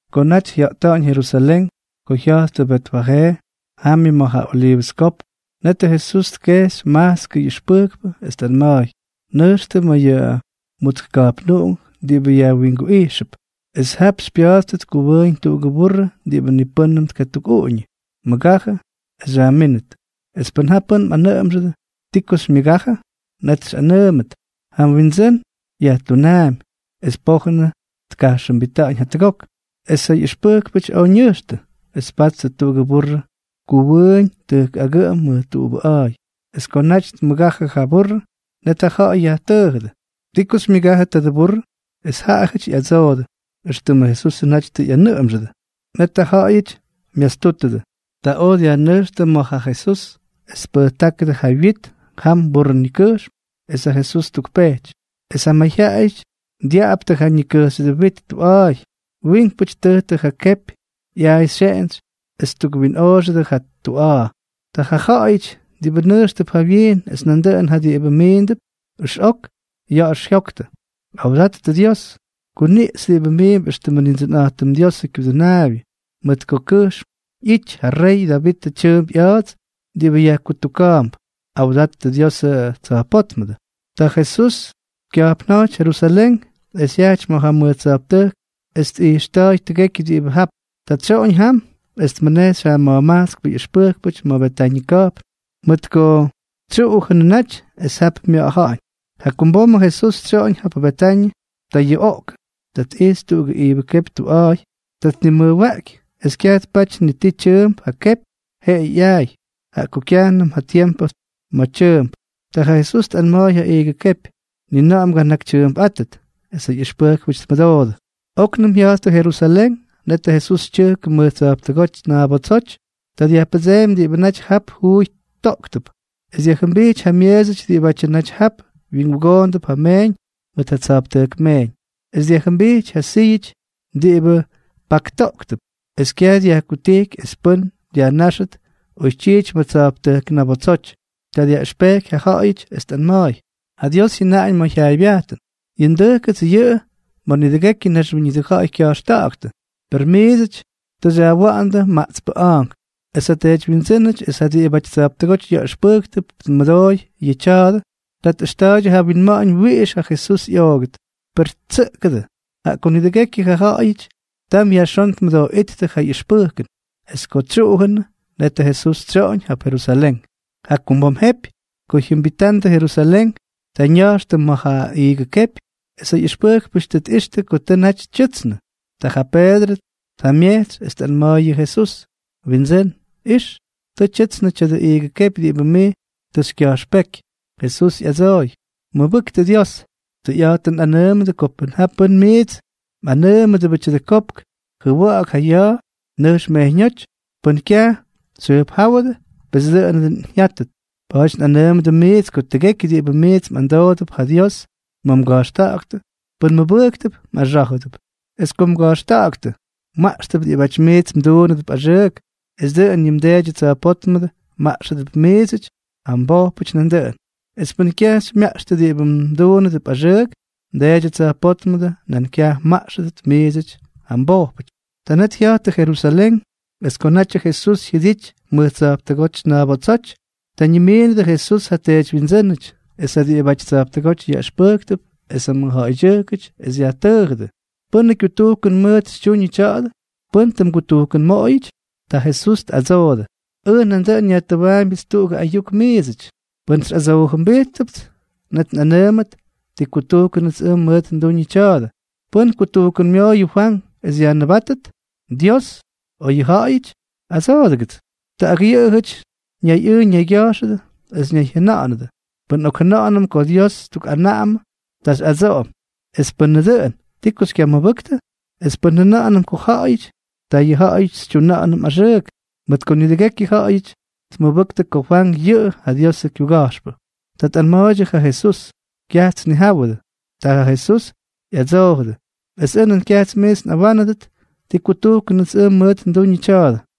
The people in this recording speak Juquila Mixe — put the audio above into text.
Ko naty jya̱ꞌta̱ꞌa̱ñ Jerusalén, ko jya̱jttʉ Betfajee, jamyʉ ma̱ ja Oliivʉs Kopk, netʉ Jesús tkejxy majtskʉ ꞌyʉxpʉjkpʉ, es tꞌanma̱a̱y: —Nʉjxtʉ ma̱ yʉ mutsk ka̱jpnuꞌunk diꞌibʉ yajwinguꞌijxʉp, es jap xypya̱a̱dʉt kuwʉʉñ tuꞌugʉ burrʉ diꞌibʉ ni pʉ́nnʉm tkatukꞌuꞌuñʉ. Mʉgajʉ es xyajmínʉt. Es pʉn ja pʉ́n myajtʉ́wʉdʉ: “¿Ti ko xymyʉgajʉ?”, net xyꞌanʉʉmʉt: “Ja Windsʉ́n yajtunaampy es pojʉn tkajxʉmbítʉt jatʉgok.” Es ja ꞌyʉxpʉjkpʉty oj ñʉjxtʉ, es tpattʉ tuꞌugʉ burrʉ kuwʉʉñ tʉjk agʉꞌʉm mʉj tuꞌubʉꞌa̱a̱y. Es ko naty tmʉgajʉ ja burrʉ, net ja ja̱ꞌa̱y yajtʉʉjʉdʉ: —¿Ti ko xymyʉgájʉdʉ tadʉ burrʉ? Es yʉꞌʉjʉty ꞌyadsoodʉ éxtʉmʉ Jesusʉ naty tʉ ꞌyanʉꞌʉmxʉdʉ. Net ja ja̱ꞌa̱y myastútʉdʉ. Ta oj dyajnʉjxtʉ ma̱ ja Jesús es tpʉjtáktʉ ja wyit jam burrʉ ñikʉjxm, es ja Jesús ttukpejty. Es ja mayjyaꞌayʉty dyaꞌptʉ ja ñikʉjxyʉdʉ wit tuꞌa̱a̱y. Wiinkpʉty ttʉjtʉ ja kepyʉ ꞌyaay xyeꞌentsy es ttukwinꞌoꞌoxʉdʉ ja tuꞌa̱a̱. Ja ja̱ꞌa̱yʉty diꞌibʉ nʉjxtʉp jawyiin es nandʉꞌʉn ja diꞌibʉ miindʉp ʉxꞌok ya̱ꞌa̱x jyoktʉ: —¡Awdattʉ Dios! ¡Kuniꞌxy diꞌibʉ miimp éxtʉmʉ Nindsʉnꞌa̱jtʉm Diosʉ kyudʉnaabyʉ! Mʉj kʉjxm ꞌyítʉt ja rey Davitʉ tyʉʉmp ꞌya̱a̱ts diꞌibʉ yajkutuka̱a̱mp. ¡Awdattʉ Diosʉ tsa̱jpótmʉdʉ! Ta ja Jesús kya̱jpnja̱jty Jerusalén es jyajty ma̱ ja mʉj tsa̱jptʉjk es tꞌijxta̱a̱y tʉgekyʉ diꞌibʉ jap. Ta tsyoꞌoñ jam es tmʉnejxy ja ma̱jmajtskpʉ ꞌyʉxpʉjkpʉty ma̱ Betañʉ ka̱jpn, mʉt ko tʉ tsyuꞌujʉnʉ naty es jap mya̱ꞌa̱ja̱ꞌa̱ñ. Jakumbom ko Jesús tsyoꞌoñ jap Betañʉ, ta yuꞌoꞌkʉ. Ta tꞌijxy tuꞌugʉ iigʉ kepy tuꞌubʉꞌa̱a̱y. Ta tnimʉjwaꞌky, es kyaj tpaty ni ti tyʉʉmp ja kepy, jeꞌeyʉ ꞌyaay, jaꞌa ko kyajnʉm ja tiempʉ ma̱ tyʉʉmp. Ta ja Jesús tꞌanma̱a̱y ja iigʉ kepy: —Ni na̱ꞌa̱ mganakytyʉʉmpꞌátʉt. Es ja ꞌyʉxpʉjkpʉty tmʉdoodʉ. Oknʉm jya̱jttʉ Jerusalén, netʉ Jesús tyʉjkʉ mʉj tsa̱jptʉjk ñabotsoty. Ta dyajpʉdseemy diꞌibʉ naty jap juuy toꞌktʉp es dyajjʉmbijty ja myeesʉty diꞌibʉ naty jap wyingugoondʉp ja meeñ mʉt ja tsa̱jptʉjk meeñ, es dyajjʉmbijty ja syíyʉty diꞌibʉ paktoꞌktʉp. Es kyaj dyajkutijky es pʉ́n dyajnáxʉt oytyiity mʉj tsa̱jptʉjk ñabotsoty. Ta dyaꞌʉxpejky ja ja̱ꞌa̱yʉty, es tꞌanma̱a̱y: —Ja Dios jyʉnáñ ma̱ ja jyaaybyajtʉn: “Yʉ ndʉjkʉts yʉꞌʉ ma̱ nidʉgekyʉ naxwíñʉdʉ ja̱ꞌa̱y kya̱jxta̱ꞌa̱ktʉ”, per miidsʉty tʉ xyajwa̱ꞌa̱ndʉ maꞌtspʉ a̱a̱nk. Es ja teedywyindsʉ́nʉty es ja diꞌibʉty tsa̱jptʉgóty yaꞌʉxpʉjktʉp tmʉdooy yʉ taadʉ. Ta tꞌʉxta̱a̱ydyʉ ja winma̱ꞌa̱ñ wiꞌix ja Jesús ꞌyoogʉt, per ttsʉꞌʉgʉdʉ, jaꞌa ko nidʉgekyʉ ja ja̱ꞌa̱yʉty tam yajxón tmʉdooꞌíttʉ ja ꞌyʉxpʉjkʉn. Es ko tsyuꞌujʉnʉ, net Jesús tsyoꞌoñ jap Jerusalén. Jakumbom jepy ko jyʉmbitandʉ Jerusalén, ta ñaxtʉ ma̱ ja iigʉ kepy, es ja ꞌyʉxpʉjkpʉty tʉ tꞌixtʉ ko tʉ naty tyʉꞌtsnʉ. Ta ja Peedrʉ tjamyejtsy, es tꞌanma̱a̱y yʉ Jesús: —Windsʉ́n, ¡ix! Tʉ tyʉtsnʉ tya̱dʉ iigʉ kepy diꞌibʉ mij tʉ xykya̱jxpéky. Jesús ꞌyadsooy: —Mʉbʉktʉ Dios. Tʉyꞌa̱jtʉn nꞌanʉʉmʉdʉ ko pʉn ja pʉ́n miits mꞌanʉʉmʉdʉbʉ tya̱dʉ kopk: “Jʉwa̱ꞌa̱k ja ya̱a̱. Nʉjx mejyñóty.” Pʉn kyaj xyjʉjpjáwʉdʉ, pes dʉꞌʉnʉ dʉn jyátʉt. Pa̱a̱ty nꞌanʉʉmʉdʉ miidsʉty ko tʉgekyʉ diꞌibʉ miits mꞌamdoodʉp ja Dios ma̱ mga̱jxta̱ꞌa̱ktʉ, pʉn mmʉbʉjktʉp, mꞌaxá̱jʉdʉp. Es ko mga̱jxta̱ꞌa̱ktʉ, mmaꞌxtʉp diꞌibáty miits mduunʉdʉp axʉʉk, es dʉꞌʉn yʉ mDeedyʉ tsa̱jpótmʉdʉ mmaꞌxʉdʉp miidsʉty ja mbojpʉty nandʉꞌʉn. Es pʉn kyaj xymyaꞌxtʉ diꞌibʉ mduunʉdʉp axʉʉk, mDeedyʉ tsa̱jpótmʉdʉ nan kyaj mmaꞌxʉdʉt miidsʉty ja mbojpʉty. Ta net jya̱jttʉ Jerusalén. Es ko natyʉ Jesús jyʉdity mʉj tsa̱jptʉjk ñabotsoty, ta ñimiinʉdʉ Jesús ja teedywyindsʉ́nʉty es ja diꞌibʉty tsa̱jptʉgóty yaꞌʉxpʉjktʉp es ja mʉjja̱ꞌa̱ydyʉjkʉty, es yajtʉʉjʉdʉ: —¿Pʉ́nʉ kyutujkʉn mʉʉt xytyuñʉ tya̱a̱dʉ? ¿Pʉ́n tʉ mgutujkʉnmoꞌoyʉty? Ta Jesús tꞌadsoodʉ: —Ʉj nandʉꞌʉn nyajtʉwaambyʉts tuꞌugʉ ayuk miidsʉty. Pʉn xyꞌadsoojʉmbijtpʉts, net nꞌanʉʉmʉt ti kutujkʉnʉts ʉj mʉʉt nduñʉ tya̱a̱dʉ. ¿Pʉ́n kutujkʉnmooyʉ Fwank es yajnʉbátʉt? ¿Dios, o yʉ ja̱ꞌa̱yʉty? ¡Adsoodʉgʉts! Ta ak yʉꞌʉjʉty ñayꞌʉʉ ñaygya̱jxʉdʉ es ñayjyʉna̱ꞌa̱nʉdʉ: —Pʉn nꞌokjʉna̱ꞌa̱nʉm ko ja Dios tukꞌanaꞌamʉ, ta xyꞌadsoꞌom: “Es pʉnʉ dʉꞌʉn, ¿ti ko xykyamʉbʉktʉ?” Es pʉn njʉna̱ꞌa̱nʉm ko ja̱ꞌa̱yʉty, ta yʉ ja̱ꞌa̱yʉty xytyuꞌunʉm axʉʉk, mʉt ko nidʉgekyʉ yʉꞌʉjʉty tmʉbʉktʉ ko Fwank yʉꞌʉ ja Diosʉ kyuga̱jxpʉ. Ta tꞌanma̱a̱ydyʉ ja Jesús: —Kyajts nnijáwʉdʉ. Ta ja Jesús ꞌyadsoojʉdʉ: —Es ʉj nan kyajts miits nꞌawánʉdʉt ti kutujkʉnʉts ʉj mʉʉt nduñʉ tya̱a̱dʉ.